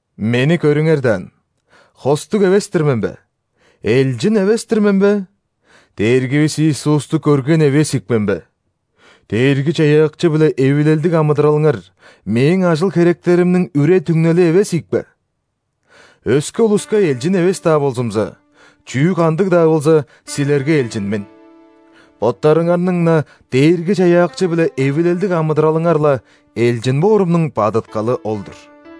Мени көрүңер даан. Хостуг эвес-тир мен бе? Элчин эвес-тир мен бе? Дээргивис Иисусту көрген эвес ийик мен бе? Дээрги-Чаяакчы-биле эвилелдиг амыдыралыңар – мээң ажыл-херектеримниң үре-түңнели эвес ийикпе? Өске улуска элчин эвес-даа болзумза, чүү-кандыг-даа болза, силерге элчин мен. Боттарыңарның-на Дээрги-Чаяакчы-биле эвилелдиг амыдыралыңар-ла – элчин боорумнуң бадыткалы ол-дур.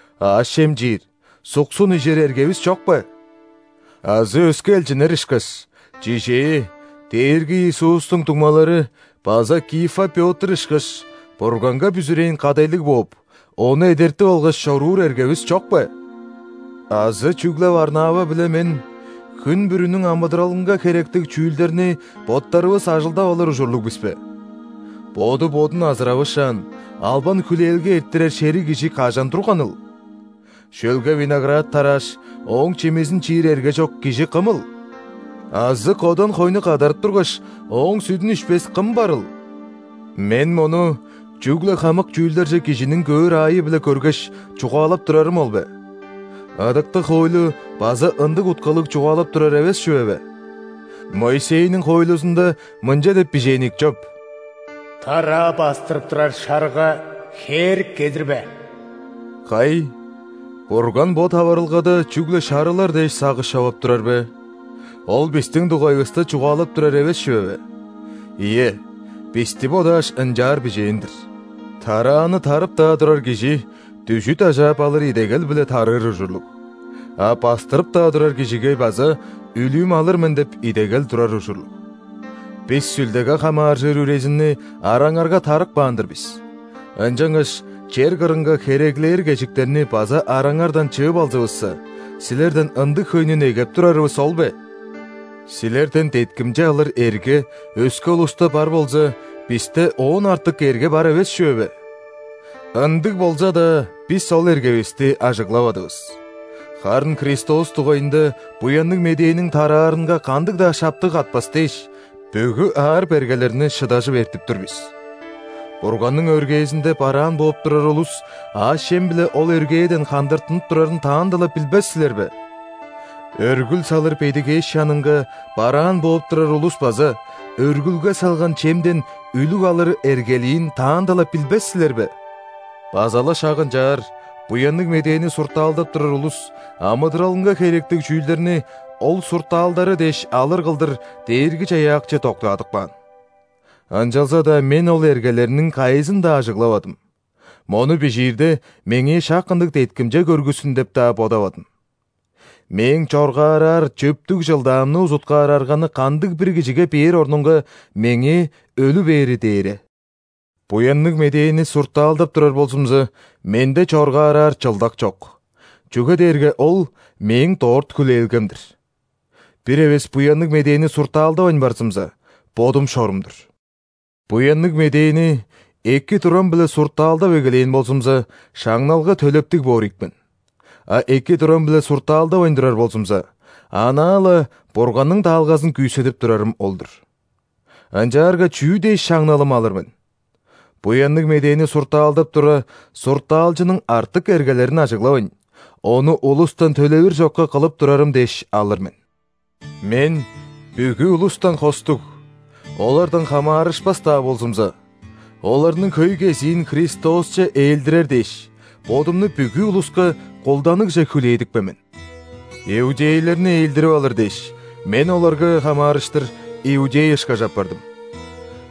Аъш-чем чиир, суксун ижер эргевис чок бе? Азы өске элчиннер ышкаш, чижээ, Дээрги Иисустуң дуңмалары база Кифа Пётр ышкаш, Бурганга бүзүрээн кадайлыг бооп, ону эдертип алгаш чоруур эргевис чок бе? Азы чүгле Варнава биле мен хүн бүрүнүң амыдыралынга херектиг чүүлдерни боттарывыс ажылдап алыр ужурлуг бис бе? Боду бодун азыравышаан, албан-хүлээлге эрттирер шериг кижи кажан турганыл? Шөлге виноград тарааш, ооң чимизин чиир эрге чок кижи кымыл? Азы кодан хойну кадарып тургаш, ооң сүдүн ишпес кым барыл? Мен мону чүгле хамык чүүлдерже кижиниң көөр аайы-биле көргеш, чугаалап турарым ол бе? Ыдыктыг хоойлу база ындыг уткалыг чугаалап турар эвес чүве бе? Моисейниң хоойлузунда мынча деп бижээн ийик чоп: «Тараа бастырып турар шарыга хээрик кедирбе». Кай, Бурган бо таварылгада чүгле шарылар дээш сагыш човап турар бе? Ол бистиң дугайывыста чугаалап турар эвес чүве бе? Ийе, бисти бодааш, ынчаар бижээн-дир! Тарааны тарып-даа турар кижи дүжүт ажаап алыр идегел-биле тарыыр ужурлуг, а бастырып-даа турар кижиге база «Үлүүм алыр мен» деп идегел турар ужурлуг. Бис Сүлдеге хамааржыр үрезинни араңарга тарып каан-дыр бис, ынчангаш чер кырынга хереглээр кежиктерни база араңардан чыып алзывысса, силерден ындыг хөйнү негеп турарывыс ол бе? Силерден деткимче алыр эрге өске улуста бар болза, бисте оон артык эрге бар эвес чүве бе? Ындыг болза-даа, бис ол эргевисти ажыглавадывыс. Харын Христос дугайында Буянныг Медээниң тараарынга кандыг-даа шаптык катпас дээш, бүгү аар-бергелерни шыдажып эртип тур бис. Бурганның өргээзинде бараан бооп турар улус аъш-чем-биле ол өргээден хандыртынып турарын таанда-ла билбес силер бе? Өргүл салыр бедигээш чанынга бараан бооп турар улус база өргүлге салган чемден үлүг алыр эргелиин таанда-ла билбес силер бе? База-ла шак ынчаар, Буянныг Медээни суртаалдап турар улус амыдыралынга херектиг чүүлдерни ол суртаалдары дээш алыр кылдыр Дээрги-Чаяакчы доктаадып каан. Ынчалза-даа мен ол эргелерниң кайызын-даа ажыглавадым, мону бижиирде, меңээ шак ындыг деткимче көргүссүн деп-даа бодавадым. Мээң чоргаараар чөптүг чылдаамны узуткаар арганы кандыг-бир кижиге бээр орнунга, меңээ өлү бээри дээре. Буянныг Медээни суртаалдап турар болзумза, менде чоргаараар чылдак чок, чүге дээрге ол – мээң дорт хүлээлгем-дир. Бир эвес Буянныг Медээни суртаалдавайн барзымза, бодум шорум-дур! Буянныг Медээни эки турам-биле суртаалдап эгелээн болзумза, шаңналга төлептиг боор ийик мен. А эки турам-биле суртаалдавайн турар болзумза, анаа-ла Бурганның даалгазын күүседип турарым ол-дур. Ынчаарга чүү дээш шаңналым алыр мен? Буянныг Медээни суртаалдап тура, суртаалчының артык эргелерин ажыглавайн, ону улустан төлевир чокка кылып турарым дээш алыр мен. Мен бүгү улустан хостуг, олардан хамаарышпас-даа болзумза, оларның хөй кезиин Христосче ээлдирер дээш, бодумну бүгү улуска кулданыгже хүлээдипкен мен. Иудейлерни ээлдирип алыр дээш, мен оларга хамаарыштыр иудей ышкаш апардым.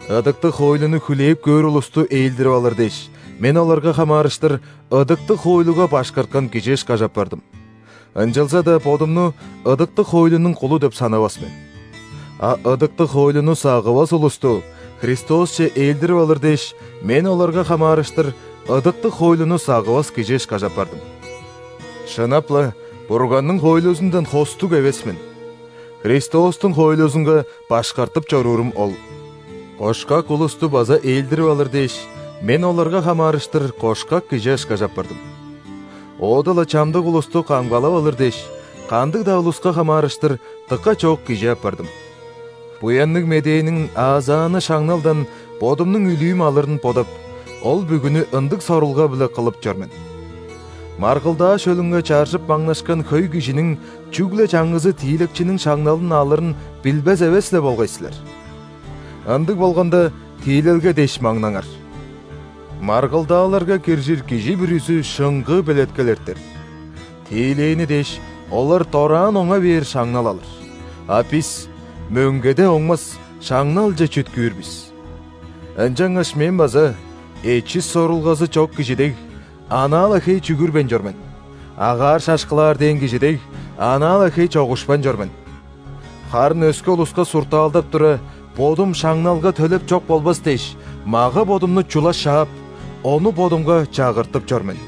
Ыдыктыг хоойлуну хүлээп көөр улусту ээлдирип алыр дээш, мен оларга хамаарыштыр ыдыктыг хоойлуга башкарткан кижи ышкаш апардым. (Ынчалза-даа бодумну ыдыктыг хоойлунуң кулу деп санавас мен.) А ыдыктыг хоойлуну сагывас улусту Христосче ээлдирип алыр дээш, мен оларга хамаарыштыр ыдыктыг хоойлуну сагывас кижи ышкаш апардым. (Шынап-ла Бурганның хоойлузундан хостуг эвес мен, Христостуң хоойлузунга башкартып чоруурум ол.) Кошкак улусту база ээлдирип алыр дээш, мен оларга хамаарыштыр кошкак кижи ышкаш апардым. Оода-ла чамдык улусту камгалап алыр дээш, кандыг-даа улуска хамаарыштыр дыка чоок кижи апардым. Буянныг Медээниң аазааны шаңналдан бодумнуң үлүүм алырын бодап, ол бүгүнү ындыг сорулга-биле кылып чор мен. Маргылдаа шөлүнге чаржып маңнашкан хөй кижиниң чүгле чаңгызы тиилекчиниң шаңналын алырын билбес эвес-ле болгай силер? Ындыг болганда, тиилелге дээш маңнаңар. Маргылдааларга киржир кижи бүрүзү шыңгыы белеткел эртер. Тиилээни дээш, олар дораан оңа бээр шаңнал алыр, а бис – мөңгеде оңмас шаңналче чүткүүр бис! Ынчангаш мен база эчис сорулгазы чок кижи дег, анаа-ла хей чүгүрбейн чор мен; агаар шашкылаар дээн кижи дег, анаа-ла хей чогушпайн чор мен. Харын өске улуска суртаалдап тура, бодум шаңналга төлеп чок болбас дээш, мага-бодумну «чула шаап», ону бодумга чагыртып чор мен.